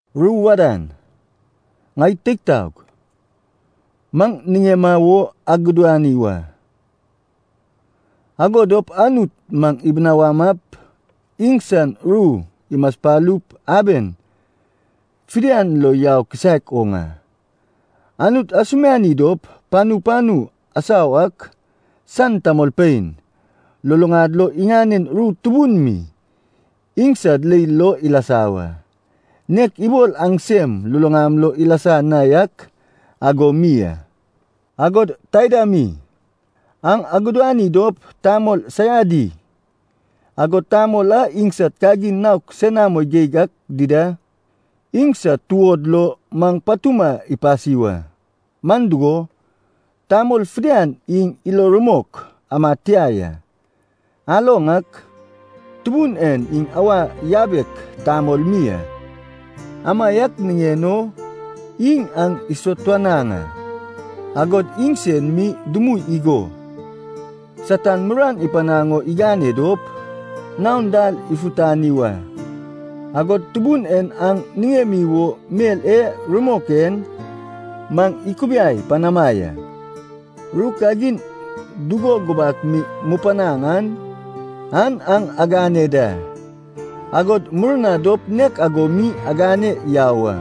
Ru wadan, ŋai teig taog, maŋ niŋema wo agudani wa. Ago dop Anut maŋ ibinawamap iŋsan ru imaspalup aben fidian lo yau kisaek oŋ a. Anut asumiani dop panu panu asau ak san tamolpein, luluŋad lo iŋanen ru tubun mi iŋsad leil lo ilasa wa, nek ibol aŋsem luluŋam lo ilasa na yak ago mi a. Agod taida mi, aŋ agudani dop tamol saiadi, agod tamol a iŋsad kagin naok senamo geig ak dida, iŋsad tuod lo maŋ patuma ipasi wa. Man dugo, tamol fidian iŋ ilo rumok amad tia ya. Aloŋ ak, Tubun en iŋ awa yabek tamol mi a. Amaiak niŋen o iŋ aŋ isatuanaŋ a. Agod iŋsen mi dumui igo, Satan muruan ipanaŋ o igane dop, naon dal ifutani wa. Agod Tubun en aŋ niŋemi wo mel e rumok en maŋ ikubiai panama ya. Ru kagin dugo gubak mi mupanaŋ an aŋ agane da, agod murna dop nek ago mi agane yau a.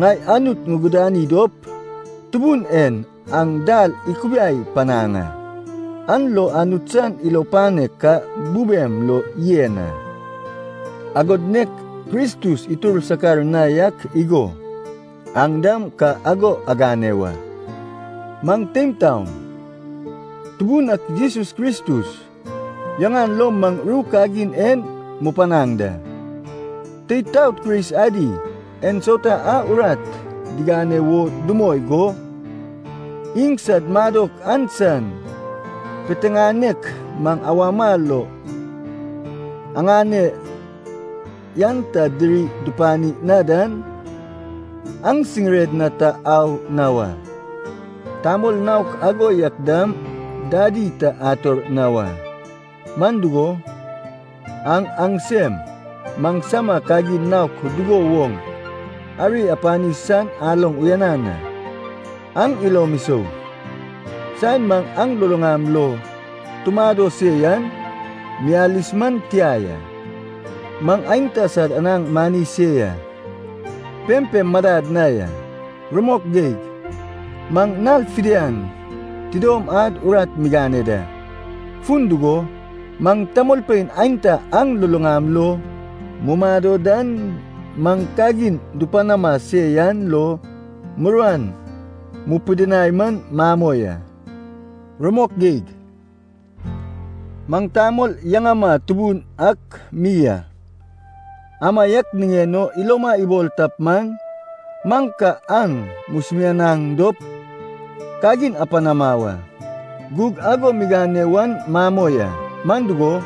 Ŋai Anut ŋugudani dop Tubun en aŋ dal ikubiai panaŋ a, an lo Anut san ilo panek ka bubem lo yen a, agod nek Kristus itur sakar na yak igo, aŋ dam ka ago agane wa. Maŋ teim taom, Tubun ak Jesus Kristus yaŋan lo maŋ ru kagin en mupanaŋ da. Teid taod Kris adi ensauta a urat digane wo dumoi go, iŋsad madok an san piteŋanek maŋ awama lo aŋane yan ta diri dupani na dan, aŋ siŋired na ta au na wa. Tamol naok ago yak dam dadi ta ator na wa. Man dugo, aŋ aŋsem maŋsama kagin naok dugo woŋ ari apani san aloŋ uyanan a. Aŋ ilom isou, saen maŋ aŋ luluŋam lo tumado se yan miyalis man tia ya. Maŋ aenta sad anaŋ mani se yan, pempem madad na ya. Rumok geig, maŋ nal fidian tidom ad urat migane da. Fun dugo, maŋ tamolpein aenta aŋ luluŋam lo dumado dan maŋ kagin dupanama se yan lo muruan mupidinai man mamoi a. Rumok geig, maŋ tamol yaŋama tubun ak mi a. Amaiak niŋen o iloma ibol tap man, maŋ ka aŋ musumianaŋ dop kagin apanama wa. Gug ago migane wan mamoi a. Man dugo,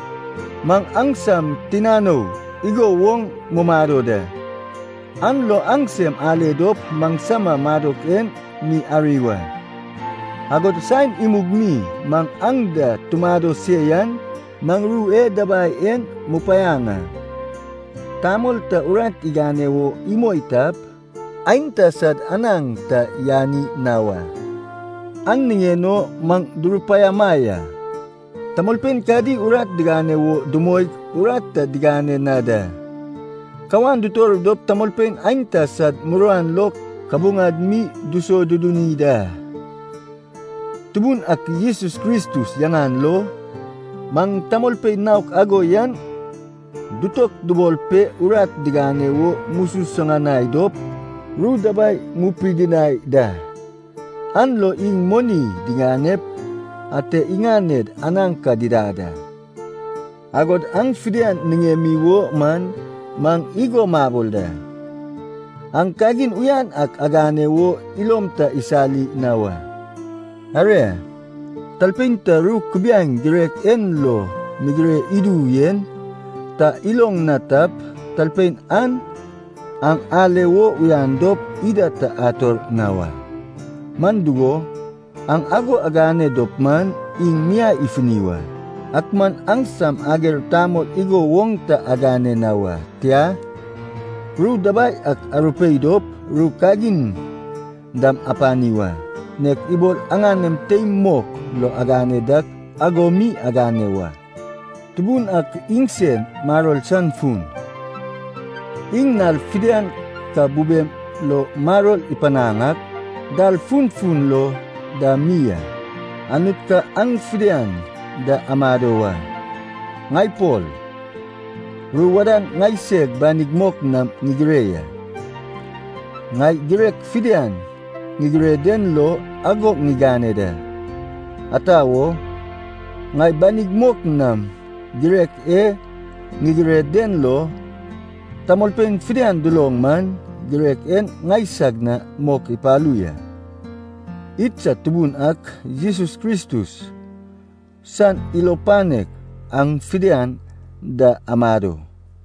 maŋ aŋsam tinanou igo woŋ mumado da, an lo aŋsem ale dop maŋsama madok en mi ari wa. Agod saen imug mi maŋ aŋ da tumado se yan maŋ ru e dabai en mupanaŋ a. “Tamol ta urat igane wo imoi tap, aenta sad anaŋ ta yani na wa.” An niŋen o maŋ durupaiama ya, tamolpein kadi urat digane wo dumoig urat ta digane na da. Kawan dutor dop tamolpein aenta sad muruan lo kabuŋad mi disoduduni da. Tubun ak Jesus Kristus yaŋan lo, maŋ tamolpein naok ago yan dutokubol pe urat digane wo mususuŋanai dop ru dabai mupidinai da. An lo iŋ moni diŋanep ate iŋaned anaŋ ka didad a. Agod aŋ fidian niŋemi wo man maŋ igo mabol da. Aŋ kagin uyan ak agane wo ilom ta isali na wa. Aria, talpein ta ru kubiaeŋ girek en lo migire idu yen ta iloŋ na tap, talpein an aŋ ale wo uyan dop ida ta ator na wa. Man dugo, aŋ ago agane dop man, iŋ miai ifuni wa. Ak man aŋsam ager tamol igo woŋ ta agane na wa. Tia, ru dabai ak arupei dop ru kagin dam apani wa. Nek ibol aŋanem teim mok lo agane dak ago mi agane wa. Tubun ak iŋsen maror san fun. Iŋ nal fidian ka bubem lo maror ipanaŋ ak, dal funfun lo dam mi a. Anut ka aŋ fidian da amado wa. Ŋai Pol ru wadan ŋaiseg banig mok nam ŋigire ya. Ŋai girek fidian ŋigire den lo ago ŋigane da. Ata wo, ŋai banig mok nam girek e ŋigire den lo, tamolpein fidian duloŋ man, girek en ŋaisag na mok ipalu ya. Idsad Tubun ak Jesus Kristus san ilo panek aŋ fidian da amado.